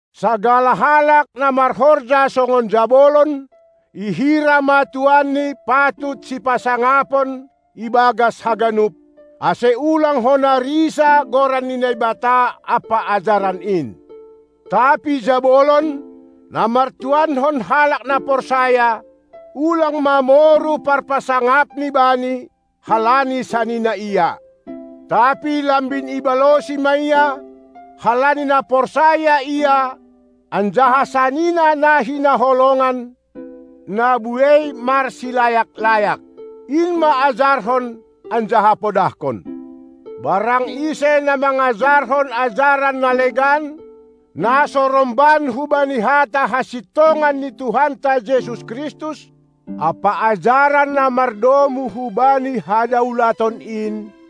Sagala halak na marhorja songon jabolon, ihira ma tuanni patut sipasangapon ibagas haganup, ase ulang hona risa goran ni Naibata ampa ajaran in. Tapi jabolon, na martuankon halak na porsaya, ulang ma moru parpasangapni bani, halani sanina ia; tapi lambin ibalosi ma ia, halani na porsaya ia anjaha sanina na hinaholongan, na buei marsilayak-layak. In ma ajarhon anjaha podahkon. Barang ise na mangajarhon ajaran na legan, na so romban hubani hata hasintongan ni Tuhanta Jesus Kristus ampa ajaran na mardomu hubani hadaulaton in,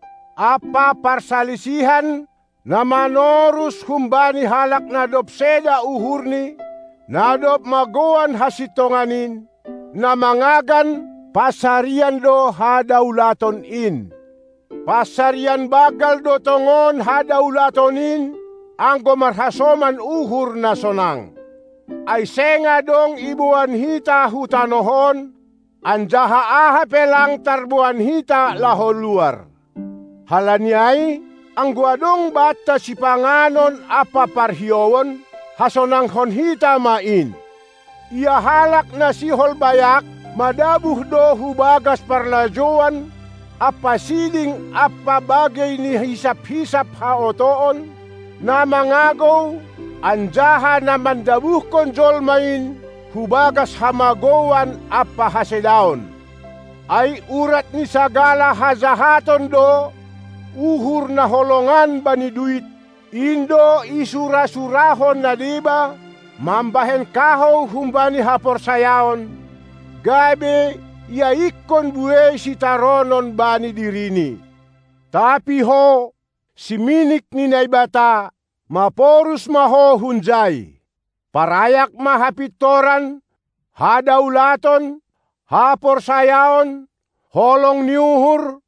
ampa parsalisihan na manorus humbani halak na dob seda uhurni, na dob magouan hasintongan in, na mangagan pansarian do hadaulaton in. Pansarian banggal do tongon hadaulaton in, anggo marhasoman uhur na sonang. Ai seng adong iboan hita hu tanoh on, anjaha aha pe lang tarboan hita laho luar. Halani ai, anggo adong banta sipanganon ampa parhiouon, hasonangkon hita ma in. Ia halak na sihol bayak, madabuh do hu bagas parlajouan ampa siding ampa bagei ni hisap-hisap haotoon, na mangagou anjaha na mandabuhkon jolma in hubagas hamagouan ampa hasedaon. Ai urat ni sagala hajahaton do uhur na holongan bani duit, in do isura-surahon na deba, mambahen kahou humbani haporsayaon, gabe iaikkon buei sitaronon bani dirini. Tapi ho, siminik ni Naibata, maporus ma ho hunjai. Parayak ma hapintoran, hadaulaton, haporsayaon, holong ni uhur,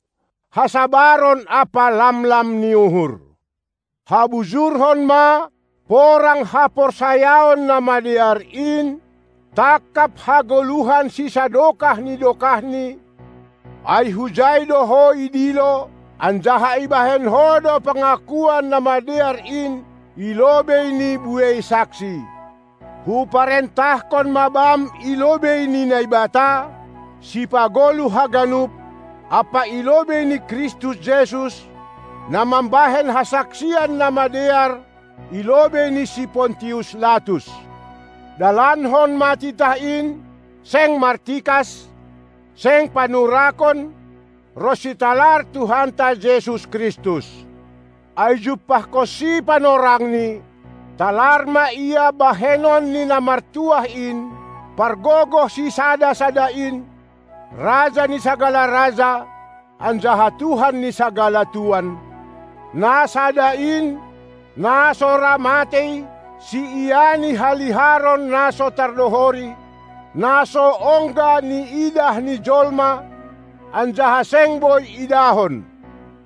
hasabaron ampa lamlam ni uhur. Habujurhon ma porang haporsayaon na madear in, tangkap hagoluhan sisadokah ni dokahni, ai hujai do ho idilo, anjaha ibahen ho do pangakuan na madear in i lobei ni buei saksi. Huparentahkon ma bam i lobei ni Naibata, sipagoluh haganup, ampa i lobei ni Kristus Jesus, na mambahen hasaksian namadear i lobei ni si Pontius Latus: Dalankon ma titah in, seng martikas, seng panurakon, ronsi talar Tuhanta Jesus Kristus. Ai jumpahkonsi panorangni, talar ma la bahenon ni Namartuah in, Pargogoh sisada-sada in, Raja ni sagala raja anjaha Tuhan ni sagala tuan, na sada in, na so ra matei, siiani haliharon na so tardohori, na so ongga niidah ni jolma, anjaha seng boi idahon.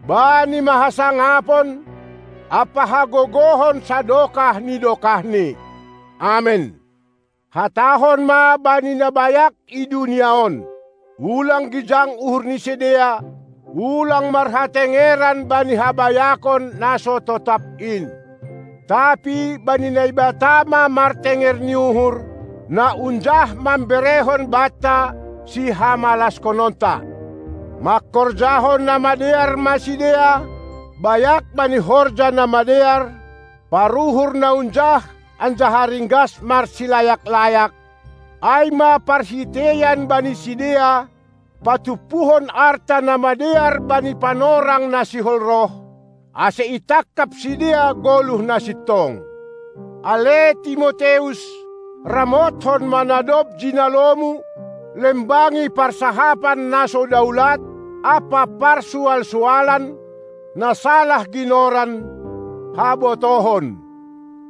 Bani ma hasangapon ampa hagogohon sadokah ni dokahni. Amen. Hatahon ma bani na bayak i dunia on: Ulang gijang uhur ni sidea, ulang marhatengeran bani habayakon na so totap in; tapi bani Naibata ma martenger ni uhur, na unjah mamberehon banta sihamalashononta. Mangkorjahon na madear ma sidea, bayak bani horja na madear, paruhur na unjah anjaha ringgas marsilayak-layak, ai ma parhiteian bani sidea, patumpuhon arta na madear bani panorang na sihol roh, ase itangkap sidea goluh na sintong. Ale Timoteus, ramothon ma na dob jinalomu; lembangi parsahapan na so daulat ampa parsual-sualan, na salah ginoran "habotohon".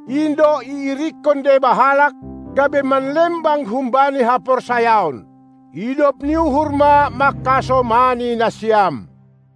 In do iirikkon deba halak, gabe manlembang humbani haporsayaon. Idop ni uhur ma mangkasomani nasiam!